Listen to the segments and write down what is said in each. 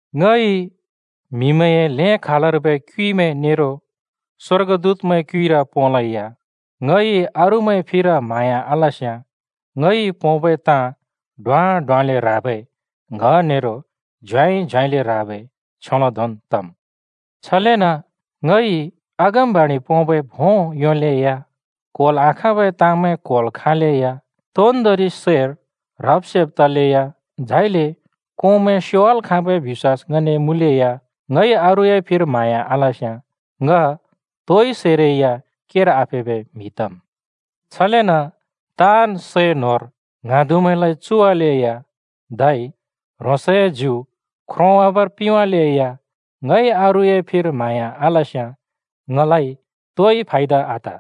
ङइ म्‍हिमैंए ल्हें खालर्बै क्युइमैं नेरो स्‍वर्गदूतमैंए क्युइर पोंलेया ङइ अरूमैंए फिर म्हाँया आलस्‍याँ, ङइ पोंबै ताँ ड्वाँ ड्वाँले ह्राबै ङ्‌ह नेरो झ्याँइ झ्याँइले ह्राबै छ्योंले धोंन् तम्। छलेन ङइ अगमबाणि पोंबै भों योंलेया, क्होल् आखाँबै ताँमैं क्होल् खाँलेया, तोन्दोंरि सैर ह्रब-सेब तलेया, झाइले कोंमैं स्‍योवाल् खाँबै बिश्‍वास ङने मुँलेया ङइ अरूए फिर म्हाँया आलस्‍याँ ङ तोइ सैरै या केर आफेबै म्हि तम्। छलेन ङए ताँन् सै न्होर ङ्हाँदुमैंलाइ चुवालेया, धै ह्रोंसए ज्यु ख्रोंवाबर पिंवालेया ङइ अरूए फिर म्हाँया आलस्‍याँ ङलाइ तोइ फायदा आत।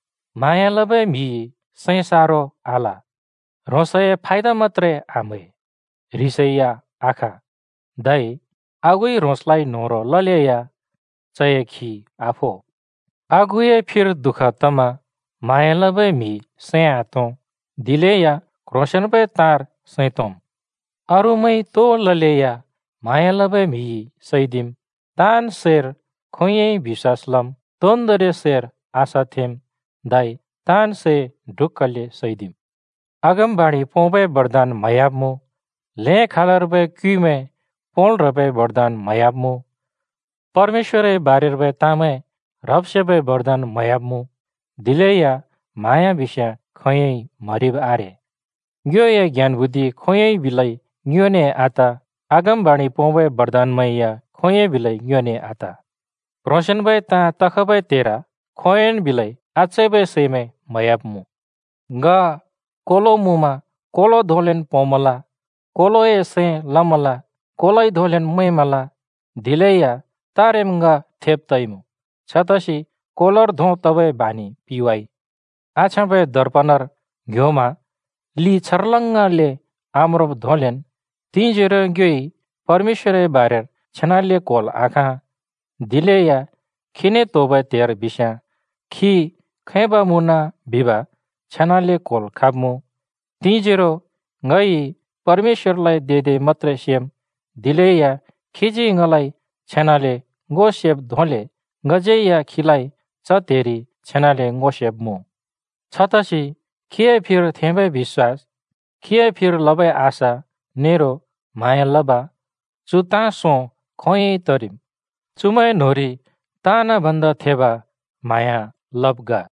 म्हाँया लबै म्हिइ सैं सारो आल, ह्रोंसए फायदा मत्‍त्रे आम्है, ह्रिसै आख, धै आगुइ ह्रोंसलाइ न्होह्रों ललेया चए खी आफो। आगुए फिर दुःख तमा म्हाँया लबै म्हि सैं आतों, दिलेया क्ह्रोंसेंन्बै ताँर सैं तोंम्। अरूमैंइ तो ललेया म्हाँया लबै म्‍हिइ सैदिम्, ताँन् सैर खोंयोंइ बिश्‍वास लम्, तोन्दोंरि सैर आशा थेंम्, धै ताँन् सै ढुक्‍कले सैदिम्। अगमबाणि पोंबै बरदान म्हयाब्‍मुँ, ल्हें खालर्बै क्युइमैं पोंल् ह्रबै बरदान म्हयाब्‍मुँ, परमेश्‍वरए बारेर्बै ताँमैं ह्रब्-सेबै बरदान म्हयाब्‍मुँ, दिलेया म्हाँया बिस्याँ खोंयोंइ म्हरिब् आरे। ङ्योए ज्ञान बुद्धि खोंयोंइ बिलै ङ्योने आत, अगमबाणि पोंबै बरदानमैं या खोंयोंन् बिलै ङ्योने आत। क्ह्रोंसेंन्बै ताँ तखबै त्हेर खोंयोंन् बिलै आचैबै सैंमैं म्हयाब्‍मुँ। ङ कोलो मुँमा कोलो धोंलेन् पोंमल, कोलोए सैं लमल, कोलोइ धोंलेन् मैंमल, दिलेया तारेम् ङ थेब तइमुँ, छतसि कोलोर धों तबै बानि पिवाइ। आछ्याँबै दर्पनर ङ्ह्‍योमा लि छर्लङ्गले आम्रोंब् धोंलेन् तिंजोरो ङ्योइ परमेश्‍वरए बारेर छेनाले क्होल् आखाँ, दिलेया खीने त्‍होबै त्हेर बिस्याँ खी खैब मुँन बिब छेनाले क्होल् खाँब्‍मुँ। तिंजोरो ङइ परमेश्‍वरलाइ दे दे मत्‍त्रे सेम्, दिलेया खीजी ङलाइ छेनाले ङो सेब् धोंले ङज्यै या खीलाइ च त्हेरि छेनाले ङो सेब्‍मुँ। छतसि खीए फिर थेंबै बिश्‍वास, खीए फिर लबै आशा नेरो म्हाँया लब, चु ताँ सों खोंयोंइ तरिम्। चुमैं न्‍होंरि ताँन् भन्दा थेब म्हाँया लब् ग।